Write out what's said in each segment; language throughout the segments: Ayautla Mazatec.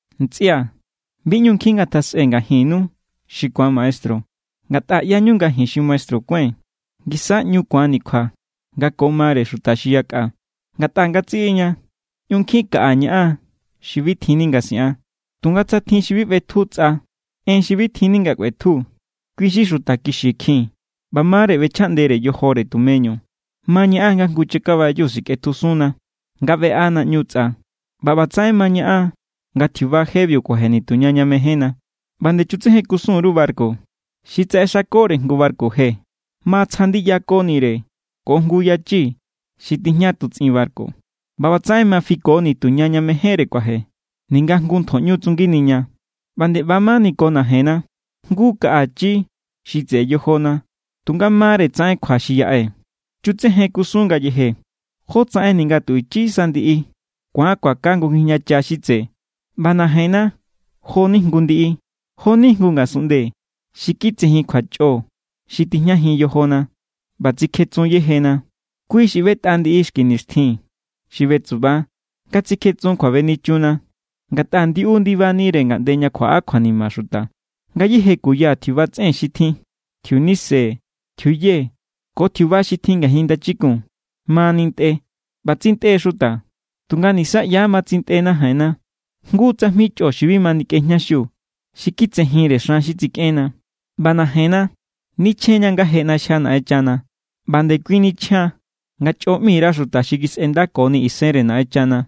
Ntsꞌia̱, bi ꞌñu nkjin ngatjasꞌe ngajinnu xi ku̱an maestru, ngatꞌa ꞌyañu nga ji̱n xi maestru kuái̱n ngisa= ꞌñu ku̱anni̱ kjua nga ko mare xuta xi yakꞌa. Ngatꞌa ngatsiꞌiña ꞌñu nkjin kaꞌa ñaꞌan xi bi tjinni nga siꞌan. Tunga tsa tjin xi bi ꞌbetju tsꞌa en xi bi tjinni nga kꞌuetju, kui= xi xuta kixikjin ꞌba ma=re ꞌbechjaꞌndere yojore tumeñu. Ma ñaꞌan nga jngu chakabayu sikꞌetjusunna nga ꞌbeꞌa naꞌñu tsꞌa. ꞌBa ꞌbatsaꞌen ma ñaꞌan nga tjiuba jebiu kuaje nituña ña mejénna. ꞌBa nde chutsejen kusun_ru barku. Xi tsaꞌexakore jngu barku je ma tsja ndiyakonire ko jngu yachi xi tijña tutsꞌin barku. ꞌBa ꞌbatsaꞌen ma fiko nituña ña mejénre kuaje, ninga jngu ntjoꞌñu tsunginiña. ꞌBa nde ꞌba= mani ko najenna. Jngu= kaꞌa ichi xi tseꞌe yojona, tunga ma=re tsaꞌen kjua xi yaꞌe. Chutsejen kusun ngayeje jotsaꞌen ninga tu ichi sa ndiꞌi ku̱an kuaka jngu ngijñacha xi tse. ꞌBa najenna jo=ni jngu ndiꞌi. Jo=ni jngu ngasunꞌnde xi kitsejin kjuachꞌo xi tijñajin yojona ꞌba tsikjetsun yejena. Kui= xi ꞌbetꞌa ndiꞌi xki nixtjin xi betsuba nga tsikjetsun kjuabenichunna, ngatꞌa ndiꞌiu ndiba=nire ngaꞌnde ña kjuaꞌa kjuanima xuta. Ngayéje kuya tjiuba tsꞌen xi tjin, tjiunise, tjiuye, ko tjiuba xi tjin ngajin ndachikun ma nintꞌe, ꞌba tsintꞌe xuta. Tunga nisaꞌya ma tsintꞌe najenna. Jngu tsajmi chꞌo xi bi ma nikꞌejñaxiu, xi kitsejinre xan xi tsikꞌenna. ꞌBa najenna nichjen=ña nga je ꞌnaxjia Naꞌenchana, ꞌba=nde kui nichjan nga chꞌo ꞌmi_ra xuta xi kisꞌendakoni isenre Naꞌenchana.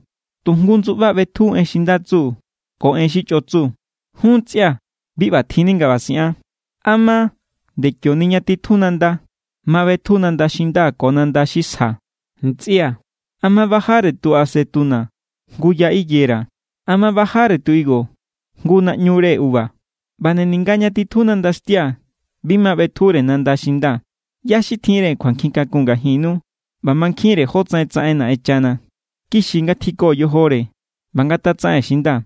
Tu jngu ndsuꞌba ꞌbetju en xi nda tsu ko en xi chꞌo tsu. Jun ntsꞌia̱, bi ꞌbatjinni nga ꞌba siꞌan. ¿A ma nde kioni ña titju nanda ma ꞌbetju nanda xi nda ko nanda xi sja? Ntsꞌia̱, ¿a ma bajare tu acetuna jngu ya higuera? ¿A ma bajare tu higo jngu naꞌñure uva? ꞌBa nde ninga ña titju nandaxtia bi ma ꞌbetjure nanda xi nda. ¿ꞌYá= xi tjinre kjuankjin kakun ngajinnu ꞌba mankjinre jótsaꞌen tsaꞌen Naꞌenchana? Kixi ngatjiko yojore ꞌba ngatatsaꞌen xi nda.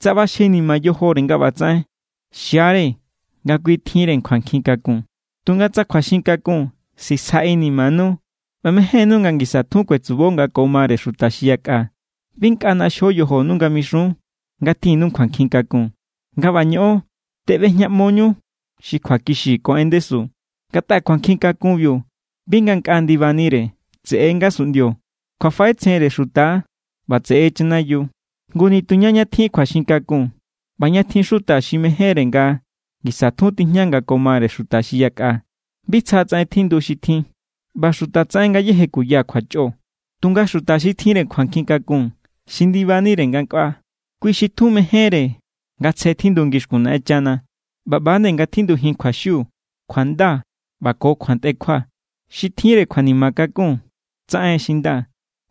Tsa ꞌbaxjenima yojore nga ꞌbatsaꞌen, xia=re nga kui tjinre kjuankjin kakun. Tunga tsa kjuaxin kakun sisja inimanu ꞌba mejénnu nga ngisa tjun kuetsubo nga ko mare xuta xi yakꞌa, bi nkꞌa ꞌnaxjo yojonu nga mixun nga tjinnu kjuankjin kakun. Nga ꞌba ñoꞌon, teꞌbejñaꞌmoñu xi kjuakixi ko en ndesu. Ngatꞌa kjuankjin kakunbiu bi ngankꞌaa ndibanire, tseꞌe= ngasunꞌndio, kjuafaꞌetsjenre xuta=, ꞌba tseꞌe= chanayiu. Ngu nituña ña tjin kjuaxin kakun ꞌba ña tjin xuta xi mejénre nga ngisa tjun tijña nga ko mare xuta xi yakꞌa, bi tsja tsaꞌen tjindu xi tjin ꞌba xuta tsaꞌen ngayéje kuya kjuachꞌo. Tunga xuta xi tjinre kjuankjin kakun xi ndibanire ngankꞌaa, kui xi tjun mejénre nga tsje tjindu ngixkun Naꞌenchana, ꞌba ꞌba nde nga tjindujin kjuaxiu, kjuanda, ꞌba ko kjuantꞌekjua. Xi tjinre kjuanima kakun, tsaꞌen xi nda,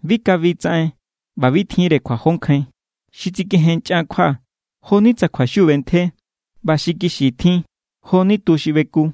bi kabi tsaꞌen ꞌba bi tjinre kjuajonkjain. Xi tsikejenchꞌan kjua, jo=ni tsa kjuaxiu ꞌbentje. ꞌBa xi kixi tjin jo=ni tu xi ꞌbeku.